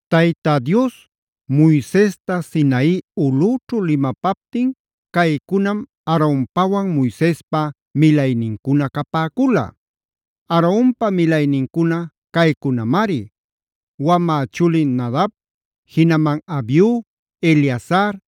Tayta Dios Moisesta Sinai ulꞌüćhu limapaptin caycunam Aaronpawan Moisespa milaynincuna capäcula. Aaronpa milaynincuna caycunamari: Wamä chulin Nadab, jinaman Abiu, Eleazar,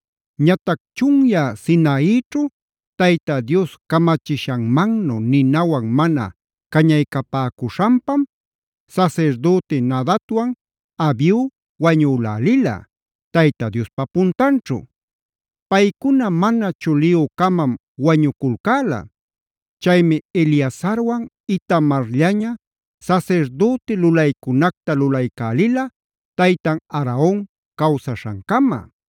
Ñatac chunyä Sinaićhu Tayta Dios camachishanmannu ninawan mana cañaycapäcuśhanpam sasirdüti Nadabwan Abiu wañülälila, Tayta Diospa puntanćhu.b Paycuna mana chuliyü-camam wañuculcäla. Chaymi Eleazarwan Itamarllaña sasirdüti lulaycunacta lulaycälila taytan Aaron cawsaśhancama.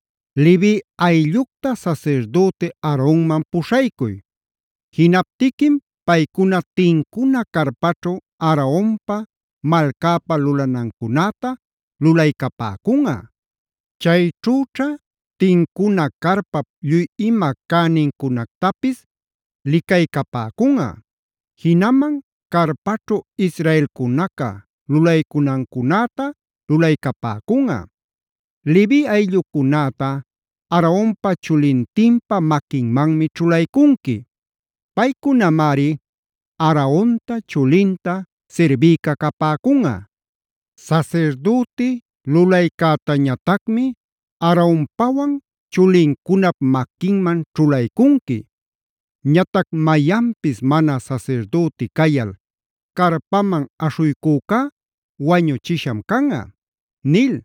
“Levi ayllucta sasirdüti Aaronman puśhaycuy. Jinaptiquim paycuna tincuna carpaćhu Aaronpa, malcäpa lulanancunäta lulaycapäcunꞌa. Chayćhüćha tincuna carpap lluy ima cänincunactapis licaycapäcunꞌa; jinaman carpaćhu Israelcunaca lulaycunancunäta lulaycapäcunꞌa. Levi ayllucunäta Aaronpa chulintinpa maquinmanmi ćhulaycunqui. Paycunamari Aaronta chulinta sirbïca capäcunꞌa. Sasirdüti lulaycätañatacmi Aaronpawan chulincunap maquinman ćhulaycunqui. Ñatac mayanpis mana sasirdüti cayal carpaman aśhuycücá wañuchisham canꞌa” nil.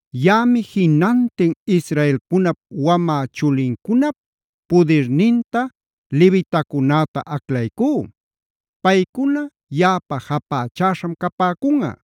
“Yaꞌami jinantin Israelcunap wamä chulincunap pudirninta levitacunäta aclaycú. Paycuna yaꞌapa japächäśham capäcunꞌa.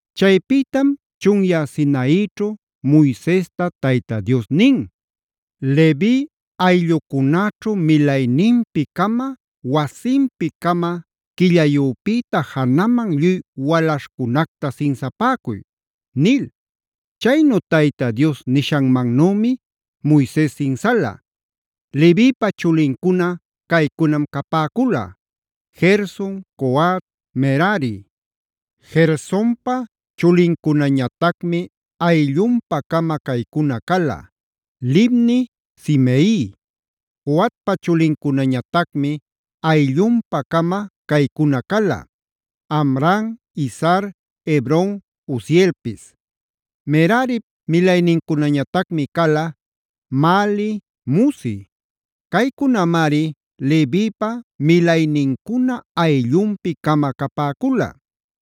Chaypïtam chunyä Sinaićhu Moisesta Tayta Dios nin: “Levi ayllucunäćhu milayninpi-cama, wasinpi-cama quillayüpïta janaman lluy walaśhcunacta sinsapäcuy” nil. Chaynu Tayta Dios nishanmanümi Moises sinsala. Levipa chulincuna caycunam capäcula: Gerson, Coat, Merari. Gersonpa chulincunañatacmi ayllunpa-cama caycuna cala: Libni, Simei. Coatpa chulincunañatacmi ayllunpa-cama caycuna cala: Amram, Izhar, Hebron, Uzielpis. Merarip milaynincunañatacmi cala: Mahli, Musi. Caycunamari Levipa milaynincuna ayllunpi-cama capäcula.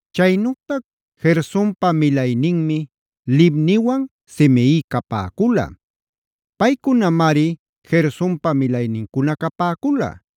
Chaynütac Gersonpa milayninmi Libniwan Simei capäcula. Paycunamari Gersonpa milaynincuna capäcula.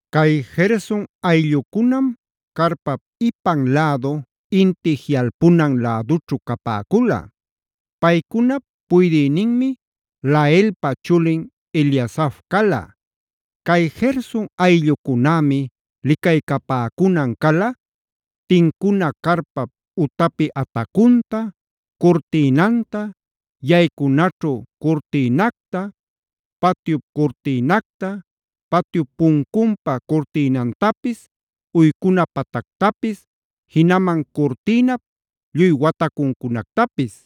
Cay Gerson ayllucunam carpap ipan lädu, inti jiꞌalpunan lädućhu capäcula. Paycunap puydïninmi Laelpa chulin Eliasaf cala. Cay Gerson ayllucunämi licaycapäcunan cala: tincuna carpap utapi atacunta, curtïnanta, yaycunaćhu curtïnacta, patyup curtïnacta, patyup puncunpa curtïnantapis, uycuna patactapis, jinaman curtïnap lluy watacuncunactapis.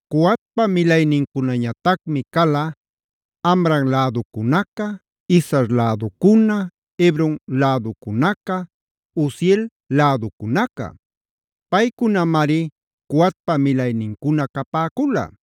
Coatpa milaynincunañatacmi cala: Amram läducunaca, Izhar läducuna, Hebron läducunaca, Uziel läducunaca. Paycunamari Coatpa milaynincuna capäcula.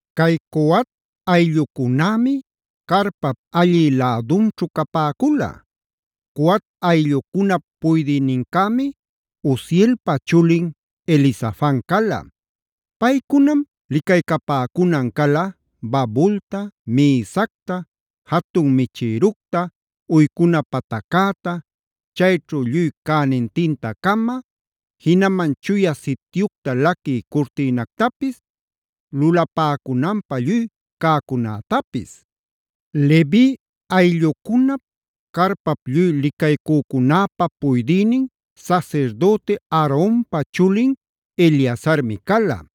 Cay Coat ayllucunämi carpap allï lädunćhu capäcula. Coat ayllucunap puydïnincämi Uzielpa chulin Elizafan cala. Paycunam licaycapäcunan cala: babulta, mïsacta, jatun michïructa, uycuna pataccäta, chayćhu lluy cänintinta-cama, jinaman Chuya Sityucta laquï curtïnactapis, lulapäcunanpä lluy cacunätapis. Levi ayllucunap, carpap lluy licaycücunäpa puydïnin sasirdüti Aaronpa chulin Eleazarmi cala.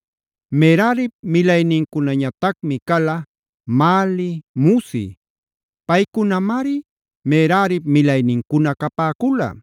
Merarip milaynincunañatacmi cala: Mahli, Musi. Paycunamari Merarip milaynincuna capäcula.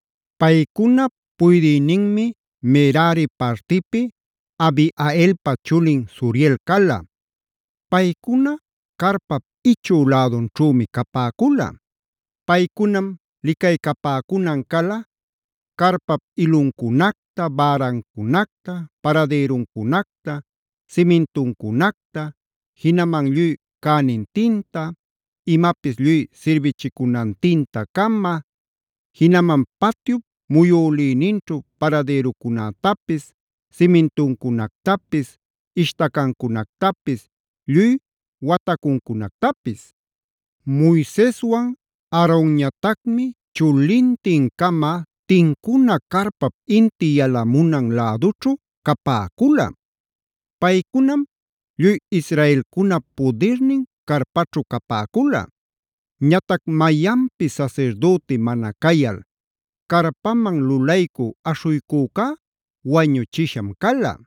Paycunap puydïninmi Merari partipi Abihailpa chulin Zuriel cala. Paycuna carpap ichü lädunćhümi capäcula. Paycunam licaycapäcunan cala: carpap iluncunacta, bärancunacta, paradïruncunacta, simintuncunacta, jinaman lluy cänintinta, imapis lluy sirbichicunantinta-cama, jinaman patyup muyülïninćhu paradïrucunätapis, simintuncunactapis, ishtacancunactapis, lluy watacuncunactapis. Moiseswan Aaronñatacmi chulintin-cama tincuna carpap inti yalamunan lädućhu capäcula. Paycunam lluy Israelcunap pudirnin carpaćhu capäcula. Ñatac mayanpis sasirdüti mana cayal carpaman lulaycu aśhuycücá wañuchisham cala.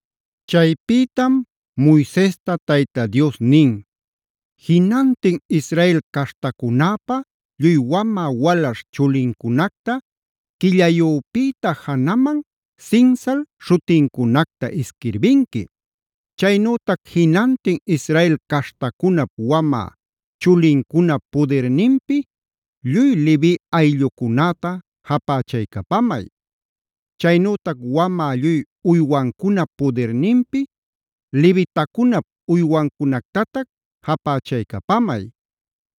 Chaypïtam Moisesta Tayta Dios nin: “Jinantin Israel caśhtacunäpa lluy wamä walaśh chulincunacta quillayüpïta janaman sinsal śhutincunacta isquirbinqui. Chaynütac jinantin Israel caśhtacunap wamä chulincunap pudirninpi lluy Levi ayllucunäta japächaycapamay. Chaynütac wamä lluy uywancunap pudirninpi levitacunap uywancunactatac japächaycapamay.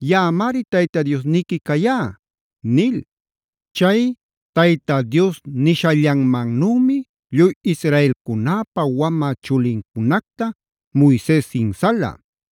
Yaꞌamari Tayta Diosniqui cayá” nil. Chay Tayta Dios nishallanmannümi lluy Israelcunäpa wamä chulincunacta Moises sinsala.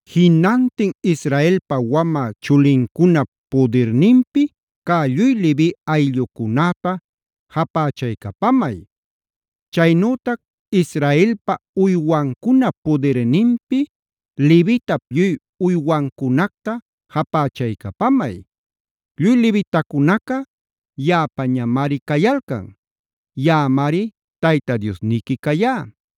“Jinantin Israelpa wamä chulincunap pudirninpi cä lluy Levi ayllucunäta japächaycapamay. Chaynütac Israelpa uywancunap pudirninpi levitap lluy uywancunacta japächaycapamay. Lluy levitacunaca yaꞌapañamari cayalcan. Yaꞌamari Tayta Diosniqui cayá.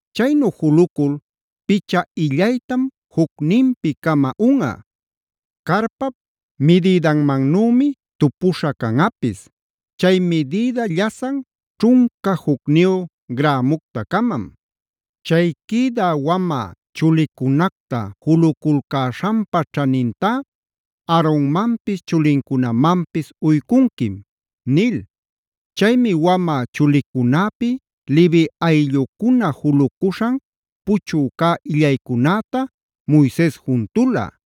Chaynu julucul picha illaytam jucninpi-cama unꞌa; carpap midïdanmannümi tupuśha canꞌapis. Chay midïda llasan ćhunca jucniyu grämucta-camam. Chay quïdä wamä chulicunacta juluculcäśhanpa ćhanintá Aaronmanpis chulincunamanpis uycunquim” nil. Chaymi wamä chulicunäpi Levi ayllucuna julucuśhan puchü cä illaycunäta Moises juntula.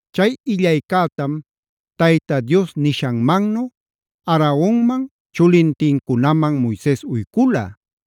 Chay illaycätam Tayta Dios nishanmannu Aaronman chulintincunaman Moises uycula.